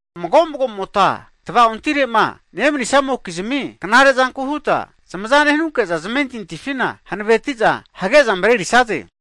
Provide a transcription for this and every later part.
Mago'magomota tava'ontirema nemanisamokizmi knare'zanku huta zamaza nehanunke'za, zmentintifina hanaveti'za hage'za marerisaze.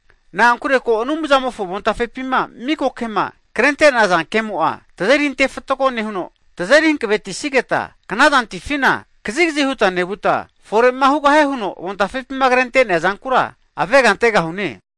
Na'ankure ko Anumzamofo avontafepima miko kema krente'naza kemo'a, tazeri antefatgo nehuno, tazeri hankavetisigeta knazantifina kazigazi huta nevuta, fore'ma hugahie huno avontafepima krente'nea zankura avega antegahune.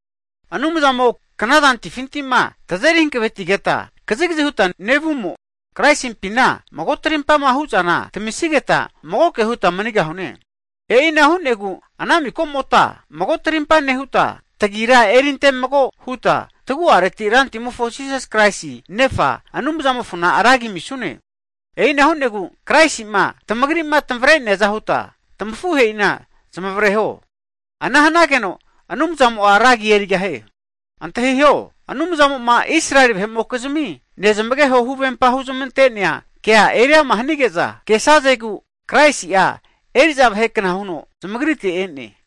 Anumzamo knazantifima tazeri hankavetigeta kazigazi huta nevumo, Kraisimpina mago tamarimpama hu'zana tamisigeta, magoke huta manigahune. E'ina hu'negu ana mikomota mago tamarimpa nehuta, tagrira erinte mago huta, tagu'areti Rantimofo Jisas Kraisi Nefa, Anumzamofona ragi amisune. E'ina hu'negu, Kraisima tamagrima tamavre'neaza huta, tamafuhe'ina zamavareho, ana hanageno Anumzamo'a ragi erigahie. Antahiho, Anumzamo'ma Israeli vahe'mokizmi nezmageho huvempa huzmante'nea kea eriama hanige'za kesazegu, Kraisi'a eri'za vahekna huno zamagritera e'ne.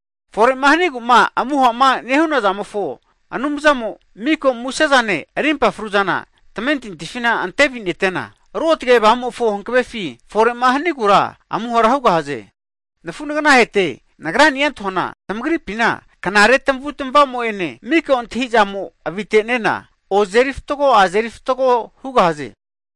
Fore'ma hanigu'ma amuha'ma nehu'na zamofo Anumzamo, miko musezane rimpa fruzana tamentintifina antevi'netena, Ruotge Avamumofo hankavefi fore'ma hanigura amuhara hugahaze. Nafu nagnaheta nagrani'a antahuana, tamagripina knare tamavutmavamo'ene mika'a antahizamo avite'nena, ozeri fatgo azeri fatgo hugahaze.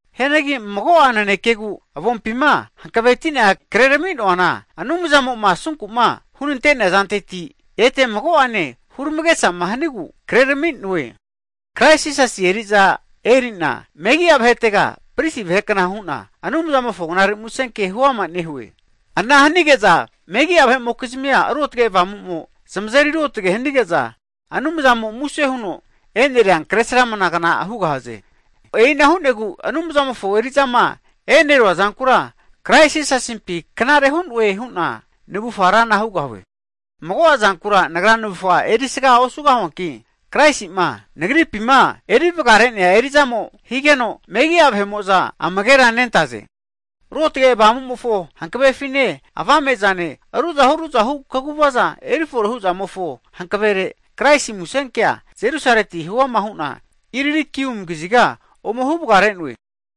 Hianagi mago'a nanekegu avompima hankavetina kreraminoana, Anumzamo'ma asunku'ma hunante'nea zanteti ete mago'ane huramagesama hanigu krerami'noe. Krais Jisasi eri'za eri'na megi'a vahetega pristi vahe kna hu'na, Anumzamofo Knare Musenke huama nehue. Ana hanige'za megi'a vahe'mokizmia Ruotge Avamumo zamazeri ruotage hanige'za, Anumzamo'ma muse huno eneria Kresramanavu ofagna hugahaze. E'ina hu'negu Anumzamofo eri'zama enerua zankura, Krais Jisasimpi knare hu'noe hu'na navufa rana hugahue. Mago'a zankura nagra navufga erisaga osugahuanki, Kraisi'ma nagripima eri vagare'nea eri'zamo higeno, megi'a vahe'mo'za amagera nentaze. Ruotge Avamumofo hankavefine, avame'zane, ruzahu ruzahu kaguvaza erifore hu'zamofo hanavere, Kraisi musenkea Jerusaleti huama hu'na Ilirikium kaziga (Masedonia-Italy) ome huvagare'noe.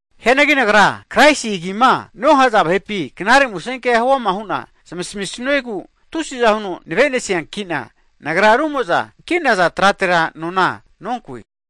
Hianagi nagra, Kraisi agima nohaza vahepi Knare Musenke huama hu'na zmasamisuegu, tusi'za huno navenesiankina nagra, rumo'za kinaza tratera nona nonkue.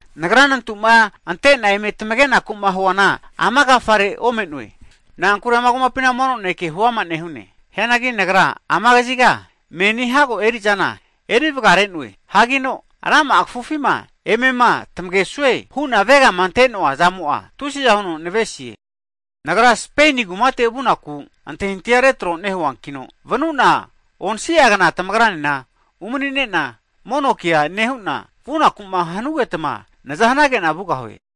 Nagra nantuma antena eme tamagenaku'ma huana ama agafare ome'noe, na'ankure ama megi'a vahe'mokizmi kumapina mono naneke huama nehune. Hianagi nagra ama kaziga menina hago eri'zana eri vagare'noe, hagino rama'a kafufima emema tamagesue hu'na avegama ante'noa zamo'a tusi'za huno navesie. Nagra Speini kumate vunaku antahintahia retro nehuankina, vanu'na onsi'a kna tamagrane umani'nena mono kea nehu'na, vunaku'ma hanugetma naza hanagena vugahue.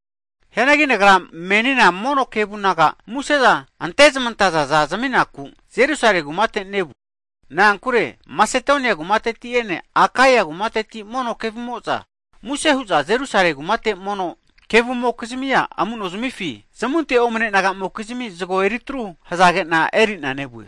Hianagi aagra menina mono kevu naga museza antezmantazaza zaminaku, Jerusalemi kumatega nevue. Na'ankure Masedonia kumateti'ene Akaia kumateti mono kevu'mo'za muse hu'za Jerusalemi kumate mono kevumokizmia amu'nozmifi, zamunte omne nagamokizmi zago eritru hazage'na erina nevue.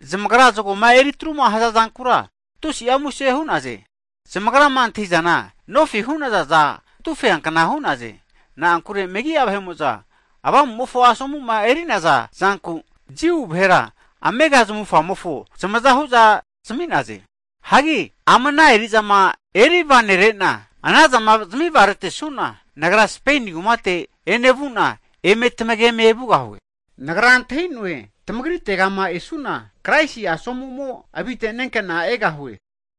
Zamagra zagoma eri atruma hazazankura tusi'a muse hu'naze. Zamagrama antahi'zana nofi hu'nazaza katufeankna hu'naze. Na'ankure megi'a vahe'mo'za Avamumofo asomu'ma eri'naza zanku, Jiu vahera amega zamufamofo zamaza hu'za zami'naze. Hagi ama ana eri'zama erivanere'na, ana zama zamivaretesuna, nagra Speini kumate enevanuna, eme tamageme vugahue. Nagra antahi'noe tamagritegama esu'na, Kraisi asomumo avite'nenkena egahue.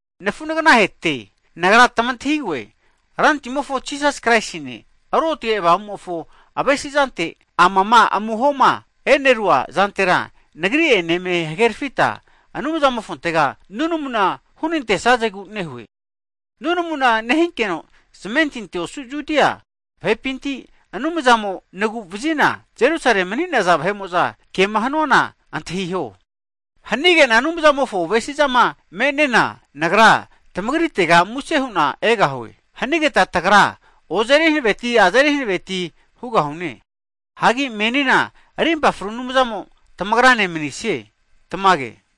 Nafu'naganahete, nagra tamantahigoe, Rantimofo Jisas Kraisine Ruotage Avamumofo avesizante, amama amuhoma e'nerua zantera nagri'ene eme hagerafita, Anumzamofontega nunamu hunantesazegu nehue. Nunamu nehinkeno zamentinti osu Judia vahepintira Anumzamo'a nagu'nevazi'na, Jerusalemi mani'naza vahe'mo'za eri'zamofonkema hanuana antahinamiho. Hanigena Anumzamofo avesizama me'nena, nagra tamagritega muse hu'na egahue. Hanigeta tagra ozeri hankaveti azeri hankaveti hugahune Hagi menina rimpa fru Anumzamo tamagrane manisie. Tamage.